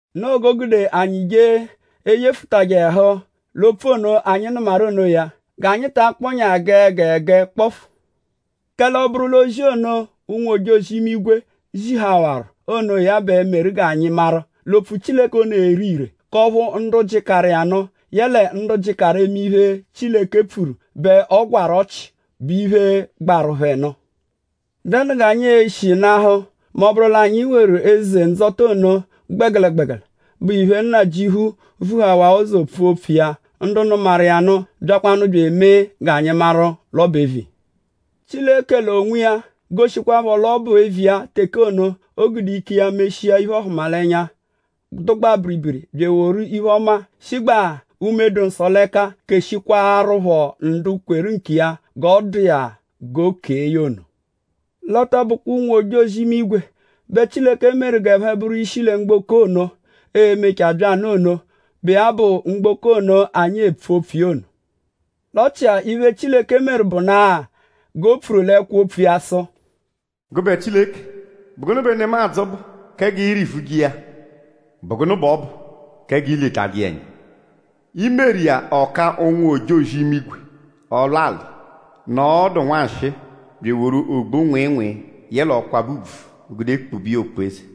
Noo g'o gude anyi jee eyefụtaru ẹhu l'opfu ono, anyi nụmaru onoya; g'anyi ta akpọnyaa gẹe gẹe gẹe kpọfu. Kẹle ọ -bụru l'ozi ono, ụnwu-ojozi-imigwe zihawaru onoya bẹ meru g'a maru l'opfu Chileke ono ere ire; k'ọphu ndu jịkaru iya nụ yẹle ndu jịkaru eme iphe, Chileke pfuru bẹ ọ gwarụ ọchi, bụ iphe, gbaru phẹ nụ; ?dẹnu g'anyi e-shi nahụ mẹ ọ -bụru l'anyi weru eze ndzọta ono gbẹgelegbegele, bụ ọphu Nnajịuphu vuhawaa ụzo pfua opfu iya; ndu nụmaru iya nụ byakwanụ bya emee g'anyi maru l'ọ bụ eviya. Chileke l'onwiya goshikwaphọ l'ọ bụ eviya teke ono, o gude ike iya meshia iphe-ọhumalenya, dụgbaa biribiri bya eworu iphe-ọma, shigbaa Unme-dụ-Nsọ l'ẹka keshikwaaruphọ ndu kweru nkiya g'ọ dụ iya g'o kee ya ono. L'ọ tọ bụkwa ụnwu-ojozi-imigwe bẹ Chileke meru g'ẹphe bụru ishi lẹ mgboko ono, e-mechaa bya nụ ono, bụ iya bụ mgboko ono, anyi epfu opfu iya ono. L'ọ chia iphe, Chileke meru bụnua g'e pfuru l'ẹkwo-opfu iya sụ: “Gụbe Chileke;?bụ gụnu bẹ nemadzụ bụ kẹ g'ị rị-vuje iya??Bụ gụnu b'ọ bụ kẹ g'i letajẹ iya ẹnya? I meru iya ọ ka ụnwu-ojozi-imigwe ọlwali; nọo ọdu nwanshịi; bya eworu ogbu-nwịinwii yẹle ọkwabe ùbvù gude kpube iya okpu-eze;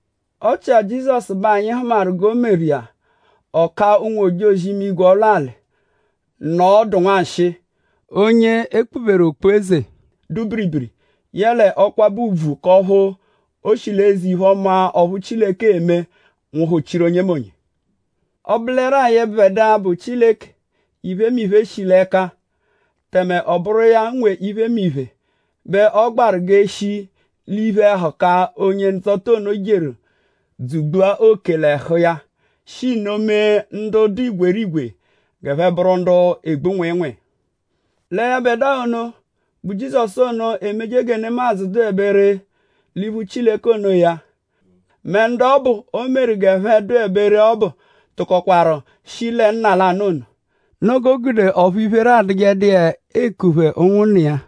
Ọ chia Jizọsu bẹ anyi hụmaru g'e meru iya ọ ka ụnwu-ojozi-imigwe ọlwali nọo ọdu nwanshịi; onye e kpuberu okpu-eze, dụ biribiri yẹle ọkwabe ùbvù k'ọphu o shi l'eze-iphe-ọma ọphu Chileke eme nwụhu-chiru onyemonye. Ọ bụleru-a yẹbedua, bụ Chileke, iphemiphe shi l'ẹka tẹme ọ bụru iya nwe iphemiphe bẹ ọ gbaru l'eshi l'iphe-ẹhuka, onye-ndzọta ono jeru dzugbua oke l'ẹhu iya; shi nno mee ndu dụ igwerigwe g'ẹphe bụru ndu egbu nwịinwii. Lẹ yẹbedua ono, bụ Jizọsu ono, emeje gẹ nemadzụ dụebe ree l'iphu Chileke onoya; mẹ ndu ọbu, o meru g'ẹphe dụebe ree ọbu tụkokwaru shi lẹ nna lanụ ono. Noo g'o gude ọphu iphere adụjedu iya eku phẹ ụnwunna iya.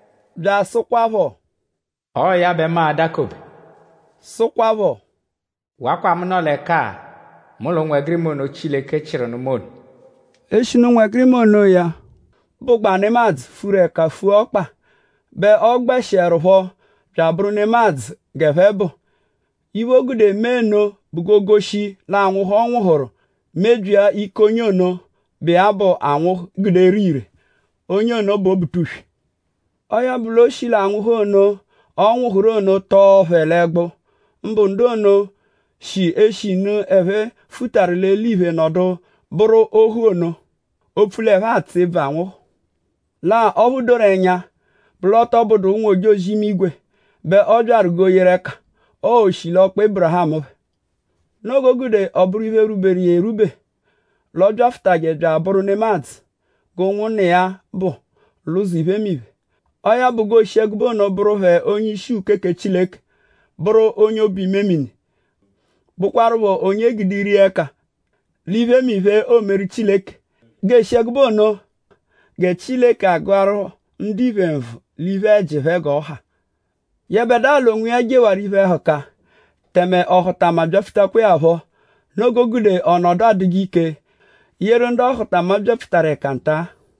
Bya asụkwapho: “Ọo ya bẹ mu a-dakobe.” Sụkwapho; “Wakwa mu nọ l'ẹka-a mu l'ụnwegirima ono, Chileke chịru nụ mu ono.” Eshinu ụnwegirima onoya bụgbaa nemadzụ, furu ẹka fua ọkpa bẹ ọ gbẹshierupho bya abụru nemadzụ g'ẹphe bụ. Iphe, o gude mee nno bụ g'oo-shi l'anwụhu, ọ nwụhuru mebyia ike onye ono, bụ iya bẹ anwụhu gude ere ire; onye ono bụ Obutuswe. Ọo ya bụ; o shi l'anwụhu ono, ọ nwụhuru ono tọo phẹ l'ẹgbu; mbụ ndu ono, shi eshinu ẹphe fụtaru l'eliphe nọdu bụru ohu ono; opfu l'ẹphe atsụ ebvu anwụhu. Lẹ-a; ọphu doru ẹnya bụ l'ọ tọ bụdu ụnwu-ojozi-imigwe bẹ ọ byaru g'o yeru ẹka; ọo oshilọkpa Ébirihamu phẹ. Noo g'o gude ọ bụru iphe, rwuberu iya erwube l'ọ byafụtaje bya abụru nemadzụ g'ụnwunna iya bụ l'ụzo iphemiphe. Ọo ya bụ g'oo-shi ẹgube ono bụru phẹ onye-ishi uke kẹ Chileke; bụru onye obu-imemini; bụkwarupho onye e gude ire iya ẹka l'iphemiphe, oomeru Chileke; g'ee-shi ẹgube ono gẹ Chileke agụaru ndiphe nvụ l'iphe-ẹji phẹ g'ọ ha. Yẹbedua l'onwiya jewaru iphe-ẹhuka; tẹme ọhutama byapfutakwaa ya phọ. Noo g'o gude ọ nọdu adụje ike yeru ndu ọhutama byapfutaru ẹka nta.